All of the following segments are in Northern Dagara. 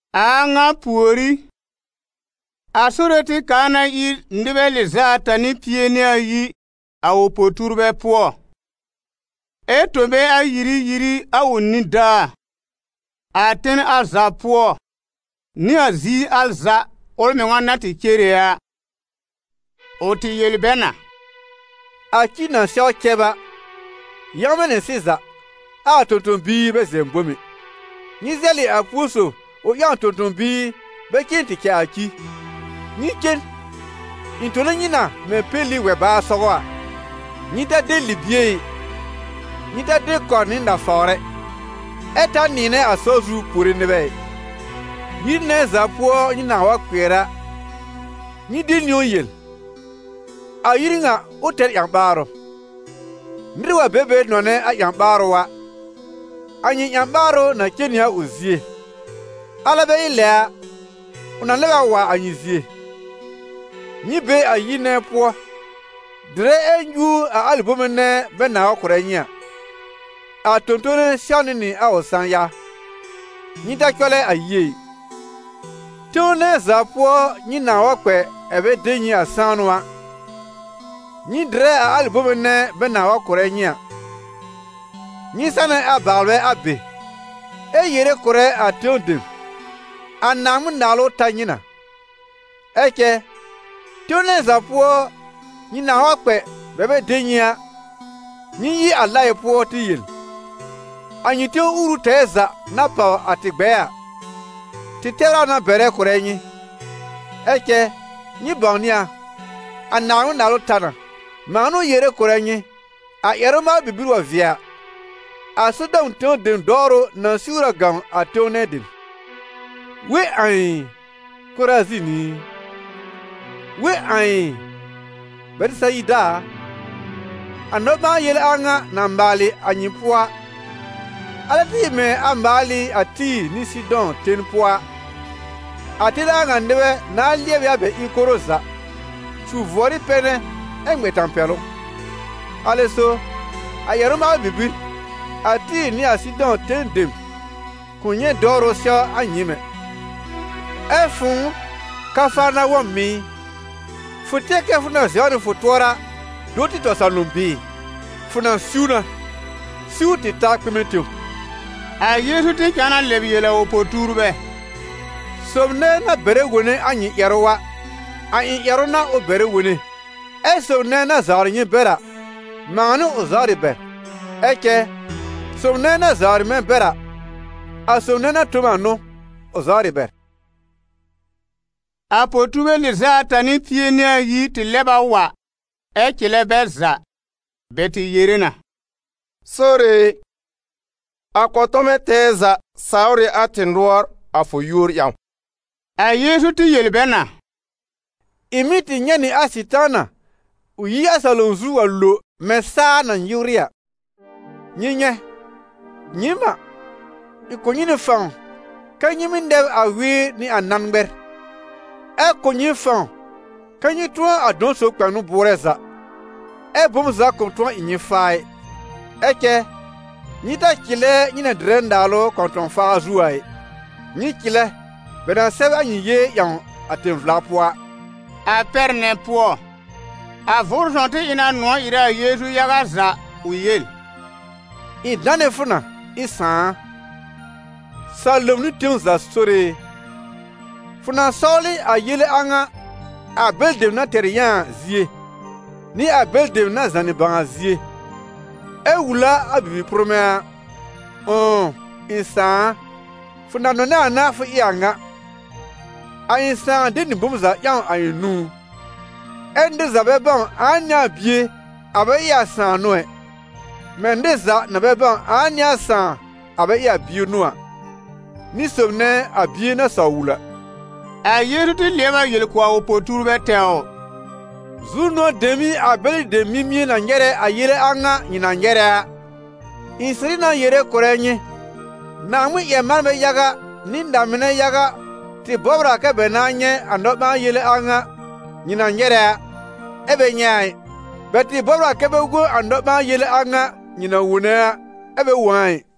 A a ŋa pùorí, a Sore tɩ kaa na ír nɩbɛ lɩz'ata nɩ pie nɩ ayi a ʋ po-tuurbɛ pʋɔ, ɛ tõ bɛ ayiri yiri a ʋ nidaa, a ten al za pʋɔ, nɩ a ziir al za ʋl mɩŋa na tɩ cere a. Ʋ tɩ yel bɛ na: «A ci na sɛw cɛb a, yãwmɛ̃ nɩ sɩza, ɛ a tõ-tõ-biir bɛ zɛ̃ bom ɛ. Nyɩ zɛlɩ a púo sob ʋ ƴãw tõ-tõ-biir bɛ cen tɩ cɛ a ci. Nyɩ cen! Ɩ̃ tone nyɩ na mɛ̃ peli wɛ-baar sɔgɔ a. Nyɩ ta de libie ɛ, nyɩ ta de kɔr nɩ nafawr ɛ, ɛ ta nɩ̃ɩnɛ a sɔr zu puore nɩbɛ ɩ. Yir nɛ za pʋɔ nyɩ nãa wa kpɩɛr a, nyɩ de niwn yel: ‹A yir ŋa, ʋ tɛr ƴã-ɓaarʋ!› Nɩr wa be be nɔnɛ a ƴã-ɓaarʋ a, a nyɩ ƴã-ɓaarʋ na cen nɩ a ʋ zie, alɛ bɛ ɩ lɛ a, ʋ na lɛb a wa a nyɩ zie. Nyɩ be a yir nɛ pʋɔ, dɩrɛ ɛ nyuur a alɩ bome nɛ bɛ nãa wa kʋ̀rɛ nyɩ a: a tõ-tõne sɛwnɩ nɩ a ʋ sã-ya. Nyɩ ta cɔlɛ a yie ɩ. Tẽw nɛ za pʋɔ nyɩ nãa wa kpɛ ɛ̀ bɛ de nyɩ sãanʋ a, nyɩ dɩrɛ a alɩ bome nɛ bɛ nãa wa kʋ̀rɛ nyɩ a. Nyɩ sanɛ a baalbɛ a be, ɛ yere kʋ̀rɛ a tẽw dem: ‹A Naaŋmɩn-Naalʋ ta nyɩ na.› Ɛ cɛ tẽw nɛ za pʋɔ nyɩ nãa wa kpɛ bɛ bɛ de nyɩ a, nyɩ yi a laɩ pʋɔ tɩ yel: ‹A nyɩ tẽw uuru tɛɛ za na pàw a tɩ gbɛɛ a, tɩ tɛbr a na bɛrɛ kʋ̀rɛ nyɩ. Ɛ cɛ nyɩ bãwnɩ a, a Naaŋmɩn-Naalʋ ta na.› Mãa n'ʋ yere kʋ̀rɛ nyɩ, a ƴɛrʋ-maalʋ bibir wa vɩɛ a, a Sodɔm tẽw dem dɔwrʋ na siwr a gãw a tẽw nɛ dem.» «We ãi, Korazin i! We ãi, Bɛtɩsayida a! A nɔ-ɓãa-yele a ŋa na maalɩ a nyɩ pʋɔ a, alɛ tɩ ɩ mɛ̃ a maal ɩ a Tɩ́ɩ̀r nɩ Sɩdɔ̃ ten pʋɔ a, a ten a ŋa nɩbɛ nãa lɩɛb ɩ a bɛ ɩb koro za, su vʋɔrɩ pɛnɛ ɛ ŋmɛ tãpɛlʋ. Alɛ so, a ƴɛrʋ-maalʋ bibir, a Tɩ́ɩ̀r nɩ a Sɩdɔ̃ ten dem kʋ̃ nyɛ̃ dɔwrʋ sɛw a nyɩɩm ɛ. Ɛ fʋ̃ʋ, Kafarnawɔm ɩ! Fʋ tɩɛr kɛ fʋ na zɛw nɩ fʋ tʋɔra do tɩ tɔ salom bɩɩ? Fʋ na siw na, siw tɩ ta kpɩmɛ tẽw.» A Yeezu tɩ cãa na lɛb yel a ʋ po-tuurbɛ: «Sob nɛ na bɛrɛ wone a nyɩ ƴɛrʋ a, a ɩ̃ ƴɛrʋ n'a ʋ bɛrɛ wone; ɛ sob nɛ na zawrɩ nyɩ bɛr a, mãa n'ʋ ʋ zawrɩ bɛr. Ɛ cɛ sob nɛ na zawrɩ mɛ̃ bɛr a, a sob nɛ na tõ m a n'ʋ ʋ zawrɩ bɛr.» A po-tuurbɛ lɩz'a ata nɩ pie nɩ ayi tɩ lɛb a wa, ɛ cɩlɛ bɛ za. Bɛ tɩ yere na: «Sore e, a kɔ̃tɔmɛ tɛɛ za sawr ɩ a tɩ nʋɔr a fʋ yúor ƴãw.» A Yeezu tɩ yel bɛ na: «Ɩ̃ mɩ́ tɩ nyɛ̃ nɩ a Sɩtaana ʋ yi a salom zu wa lo mɛ̃ saa na nyɩwrɩ a. Nyɩ nyɛ̃, nyɩɩm n'a, ɩ̃ kʋ̀ nyɩ nɩ fãw kɛ nyɩ mɩ́ nɛb a wɩɩr nɩ a nãn ŋmɛr, ɛ kʋ̀ nyɩ fãw kɛ nyɩ tʋ̃ɔ a dɔ̃ sob kpɛnʋ bʋʋrɛ za, ɛ bom za kʋ̃ tʋ̃ɔ ɩ nyɩ faa ɛ. Ɛ cɛ nyɩ ta cɩlɛ nyɩ na dɩrɛ naalʋ kɔ̃tɔ̃-faar zu a ɩ, nyɩ cɩlɛ bɛ na sɛb a nyɩ yée ƴãw a tẽ-vla pʋɔ a.» A pɛr nɛ pʋɔ, a Vʋʋrʋ Sõw tɩ ɩ na nʋ̃ɔ̀ ɩrɛ a Yeezu yaga za ʋ yel: «Ɩ̃ danɛ fʋ na, ɩ̃ Sãà a, salom nɩ tẽw za Sore e, fʋ na sɔwlɩ a yele a ŋa a bɛlɩ dem na tɛr yã a zie, nɩ a bɛlɩ dem na zànɩ bãw a zie, ɛ wul a a bibi-pʋrmɛ̃ a. Ʋ̃ʋ, ɩ̃ Sãà a, fʋ na nɔnɛ a n'a fʋ ɩ a ŋa.» «A ɩ̃ Sãà de nɩ bom za ƴãw a ɩ̃ nũú, ɛ́ nɩr za bɛ bãw ãa n'ɩ a Bie a bɛ ɩ a Sãà n'ʋ ɛ, mɛ̃ nɩr za na bɛ bãw ãa n'ɩ a Sãà a bɛ ɩ a Bie n'ʋ a, nɩ sob nɛ a Bie na saw wul a.» A Yeezu tɩ lɩɛb a yel kʋ̀ a ʋ po-tuurbɛ tɛwr: «Zu-nʋ̃ɔ̀ dem n'ɩ a bɛlɩ dem mimie na nyɛrɛ a yele a ŋa nyɩ na nyɛrɛ a. Ɩ̃ sɩrɩ na yere kʋ̀rɛ nyɩ, Naaŋmɩn-ƴɛr-manbɛ yaga nɩ na-mɩnɛ yaga tɩ bɔbr a kɛ bɛ nãa nyɛ̃ a nɔ-ɓãa-yele a ŋa nyɩ na nyɛrɛ a, ɛ bɛ nyɛ̃ a ɩ, bɛ tɩ bɔbr a kɛ bɛ wõ a nɔ-ɓãa-yele a ŋa nyɩ na wone a, ɛ bɛ wõ a ɩ.»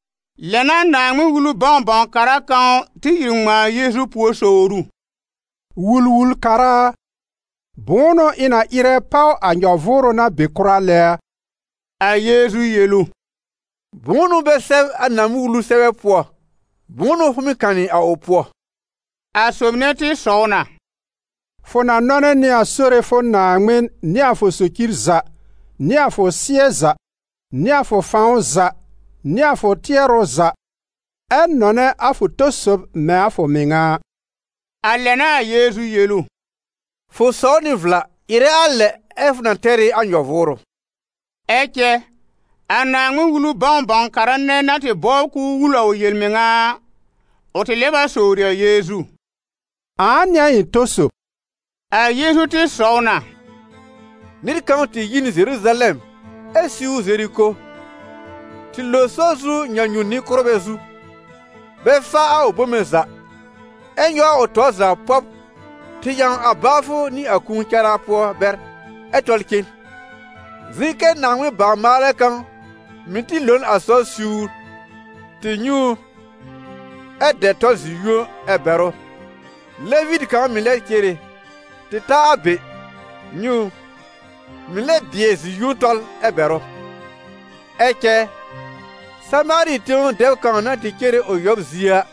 Lɛ n'a Naaŋmɩn-Wulu bãw-bãw-kara kãw tɩ ìr ŋmãa a Yeezu pùor sowr ʋ: «Wul-wul-kara a, bʋ̃ʋ n'ʋ ɩ̃ na ɩrɛ páw a nyɔ-vʋʋrʋ na be kʋra lɛ a?» A Yeezu yel ʋ: «Bʋ̃ʋ n'ʋ bɛ sɛb a Naaŋmɩn-Wulu sɛbɛ pʋɔ? Bʋ̃ʋ n'ʋ fʋ mɩ́ kanɩ a ʋ pʋɔ?» A sob nɛ tɩ sɔw na: « ‹Fʋ na nɔnɛ nɩ a Sore fʋ Naaŋmɩn nɩ a fʋ socir za, nɩ a fʋ sɩ́ɛ za, nɩ a fʋ fãw za nɩ a fʋ tɩɛrʋ za›, ɛ ‹nɔnɛ a fʋ tɔ sob mɛ̃ a fʋ mɩŋa a.›» A lɛ n'a a Yeezu yel ʋ: «Fʋ sɔw nɩ vla! Ɩrɛ a lɛ ɛ fʋ na tɛr ɩ a nyɔ-vʋʋrʋ.» Ɛ cɛ a Naaŋmɩn-Wulu bãw-bãw-kara nɛ na tɩ bɔbr k'ʋʋ wul a ʋ yel-mɩŋa a, ʋ tɩ lɛb a sowri a Yeezu: «Ãa n'ɩ a ɩ̃ tɔ sob?» A Yeezu tɩ sɔw na: «Nɩr kãw tɩ yi n Zeruzalɛm ɛ siwr Zeriko, tɩ lo sɔr zu nyãnyu-nɩ-kʋ́rbɛ zu, bɛ fa a ʋ bome za ɛ nyɔw a ʋ tɔr za pɔb tɩ ƴãw a baafʋ nɩ a kũu cara pʋɔ bɛr, ɛ tɔl cen. Zɩ̃ kɛ Naaŋmɩn bawr-maalɛ kãw mɩ̀ tɩ lo n a sɔr siwr, tɩ nyɛ̃ ʋ, ɛ dɛ tɔl zi-yũo ɛ bɛr ʋ. Levitɩ kãw mɩ̀ lɛ cere tɩ ta a be, nyɛ̃ ʋ, mɩ̀ lɛ bɩɛ zi-yũo tɔl ɛ bɛr ʋ. Ɛ cɛ Samaari tẽw dɛb kãw na tɩ cere ʋ yɔb zie a,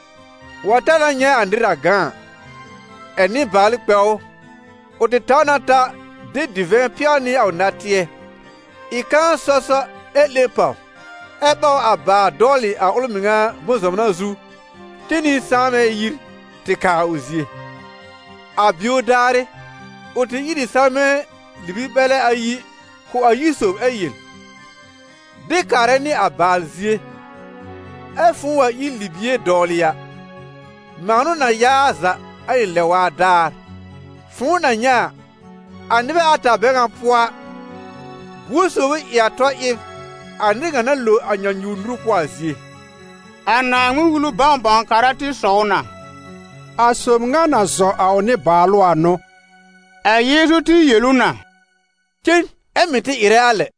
wa ta na nyɛ̃ nɩr na gã a, ɛ̀ nɩbaalʋ kpɛ ʋ. Ʋ tɩ taw na ta de divɛ̃ pɛw nɩ a ʋ natɩɛ, ɩ kãa sɔ sɔ, ɛ 'lẽ pàw, ɛ ɓaw a baal dɔwlɩ a ʋl mɩŋa bʋ̃-zɔmna zu cen nɩ sãanbɛ yir tɩ kaa ʋ zie. A bio daarɩ, ʋ tɩ ír ɩ salmɛ̃ libi-mɛlɛ ayi kʋ̀ a yir sob ɛ yel: ‹De kaarɛ nɩ a baal zie, ɛ fʋ̃ʋ wa ír libie dɔwlɩ a, mãa n'ʋ na ya a za a ɩ̃ lɛ-waa daar.› «Fʋ̃ʋ na nyɛ̃ a, a nɩbɛ ata bɛ ŋa pʋɔ a, buor sob ʋ ɩ a tɔ ɩb a nɩr ŋa na lo a nyãnyuwr nuru pʋɔ a zie?» A Naaŋmɩn-Wulu bãw-bãw-kara tɩ sɔw na: «A sob ŋa na zɔ a ʋ nɩbaalʋ a n'ʋ.» A Yeezu tɩ yel ʋ na: «Cen, ɛ mɩ̀ tɩ ɩrɛ a lɛ.»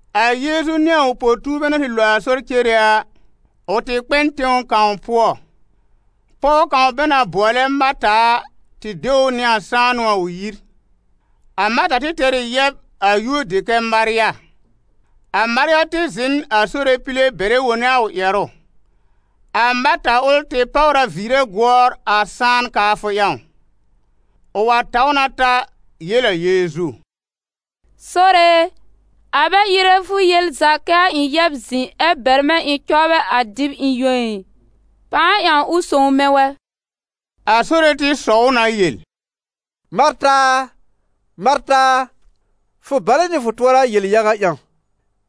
A Yeezu nɩ a ʋ po-tuurbɛ na tɩ lo a sɔr cere a, ʋ tɩ kpɛ n tẽw kãw pʋɔ. Pɔw kãw bɛ na bʋɔlɛ Marta a, tɩ de ʋ nɩ a sãanʋ a ʋ yir. A Marta tɩ tɛr ɩ yɛb a yúor dɩ kɛ Marya. A Marya tɩ zɩ̃ n a Sore pile bɛrɛ wone a ʋ ƴɛrʋ. A Marta ʋl tɩ páwr a viire gʋɔr a sãan kaafʋ ƴãw. Ʋ wa taw na ta yel a Yeezu: «Sore e, a bɛ ɩrɛ fʋ yel za kɛ a ɩ̃ yɛb zɩ̃ ɛ bɛr mɛ̃ ɩ̃ cɔbrɛ a dɩb ɩ̃ yõ ɩ? Pãa ƴãw ʋ sõw mɛ̃ wɛ!» A Sore tɩ sɔw ʋ na yel: «Marta a, Marta a, fʋ balɛ nɩ fʋ tʋɔra yel-yaga ƴãw,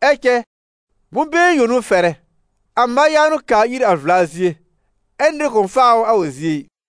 ɛ cɛ bʋ̃-been yõ n'ʋ fɛrɛ. A Marya n'ʋ kaa ir a vla zie, ɛ nɩr kʋ̃ faa ʋ a ʋ zie ɩ.»